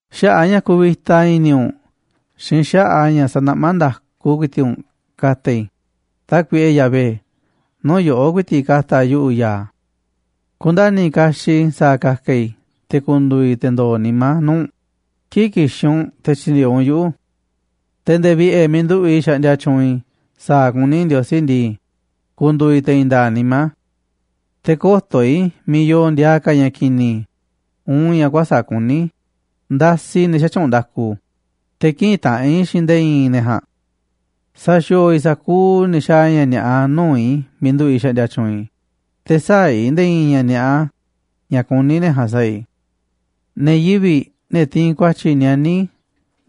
Xaꞌa̱ꞌ ña̱ kuvita i̱ni̱ u̱nꞌ xiinꞌ xaꞌa̱ꞌ ña̱ sanaꞌmá nda̱ku ku̱i̱ti̱ꞌ u̱nꞌ ka̱ta̱ i̱, Tákuiꞌe Yahvé, nuu̱ꞌ yoꞌó ku̱i̱ti̱ꞌ ka̱ta̱ yuꞌu̱ ya̱a̱. Ku̱nda̱ni̱ kaxiꞌ i̱ sa̱a̱ ka̱ka̱ i̱ te̱ ku̱ndu̱u̱ i̱ te̱ ndo̱o̱ nimá nuu̱ꞌ u̱nꞌ kii̱ꞌ ki̱xi̱ u̱nꞌ te̱ tyi̱ndi̱e̱eꞌ u̱nꞌ yuꞌu̱. Te̱ nde̱e̱ vi̱ꞌe̱ miiꞌ nduꞌu̱ꞌ i̱ xaꞌndia tyuunꞌ i̱ sa̱a̱ kuní Ndiosí ndii, ku̱ndu̱u̱ i̱ te̱ i̱i̱n nda̱a̱ꞌ nimá. Te̱ kö̱to̱ i̱ miiꞌ yoo ndiaa ka̱ ña̱ ki̱ni̱ uun ña̱ kuäsa̱ꞌ kuní, ndasiꞌ i̱ ne̱ xätyuunꞌ nda̱ku, te̱ kï̱ꞌi̱n taꞌanꞌ i̱ xiinꞌ nde̱e̱ i̱i̱n ne̱ ja̱a̱nꞌ. Sa̱xi̱o̱o̱ i̱ sa̱kuuꞌ ne̱ xaaꞌ ña̱ ni̱a̱ꞌa nuu̱ꞌ i̱ miiꞌ nduꞌu̱ i̱ xaꞌndia tyuunꞌ i̱, te̱ sä̱a̱ i̱ nde̱e̱ i̱i̱n ña̱ ni̱a̱ꞌa ña̱ kuní ne̱ ja̱a̱nꞌ sa̱a̱ i̱. Ne̱ yivi̱ꞌ, ne̱ tiinꞌ ku̱a̱tyi̱ nianí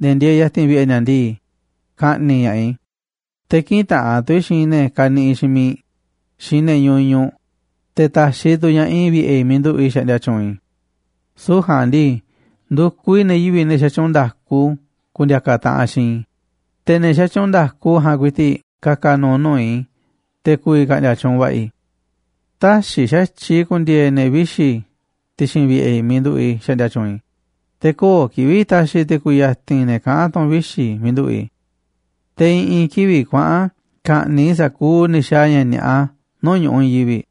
ne̱ ndieeꞌ ya̱ti̱n vi̱ꞌe̱ ni̱a̱ ndii, ka̱ꞌni̱ꞌ ña̱ꞌaꞌ i̱, te̱ kï̱ꞌi̱n taꞌanꞌ tu̱ i̱ xiinꞌ ne̱ kaniꞌiꞌ xiinꞌ miiꞌ, xiinꞌ ne̱ ñuñuꞌ, te̱ ta̱xiꞌ tu̱ ña̱ꞌaꞌ i̱ vi̱ꞌe̱ i̱ miiꞌ nduꞌu̱ꞌ i̱ xaꞌndia tyuunꞌ i̱. Süu̱ꞌ ja̱a̱nꞌ ndii, ndu̱kuꞌ i̱ ne̱ yivi̱ꞌ, ne̱ xatyuunꞌ nda̱ku ku̱ndi̱a̱ka̱ taꞌanꞌ xiinꞌ i̱, te̱ ne̱ xatyuunꞌ nda̱ku ja̱a̱nꞌ ku̱i̱ti̱ꞌ ka̱ka̱ nu̱u̱ nuu̱ꞌ i̱ te̱ ku̱vi̱ ka̱ꞌndi̱a̱ tyuunꞌ va̱ꞌa̱ i̱. Tä̱xi̱ xa̱tyiꞌ i̱ ku̱ndi̱e̱e̱ ne̱ vixi̱ ti̱xi̱n vi̱ꞌe̱ i̱ miiꞌ nduꞌu̱ꞌ i̱ xaꞌndia tyuunꞌ i̱, te̱ köo̱ꞌ kivi̱ꞌ ta̱xi̱ tu̱ i̱ ku̱ya̱ti̱n ne̱ kaꞌán tu̱n vixi̱ miiꞌ nduꞌu̱ꞌ i̱. Te̱ i̱ꞌi̱n kivi̱ꞌ kuaꞌa̱n ka̱ꞌni̱ꞌ i̱ sa̱kuuꞌ ne̱ xaaꞌ ña̱ ni̱a̱ꞌa nuu̱ꞌ ñu̱ꞌuꞌ i̱i̱n yivi̱ꞌ,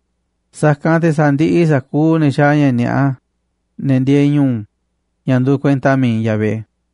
sa̱kanꞌ te̱ sa̱ndiꞌiꞌ i̱ sa̱kuuꞌ ne̱ xaaꞌ ña̱ ni̱a̱ꞌa, ne̱ ndieeꞌ ñu̱u̱, ña̱ nduuꞌ kuenta mi̱iꞌ Yahvé.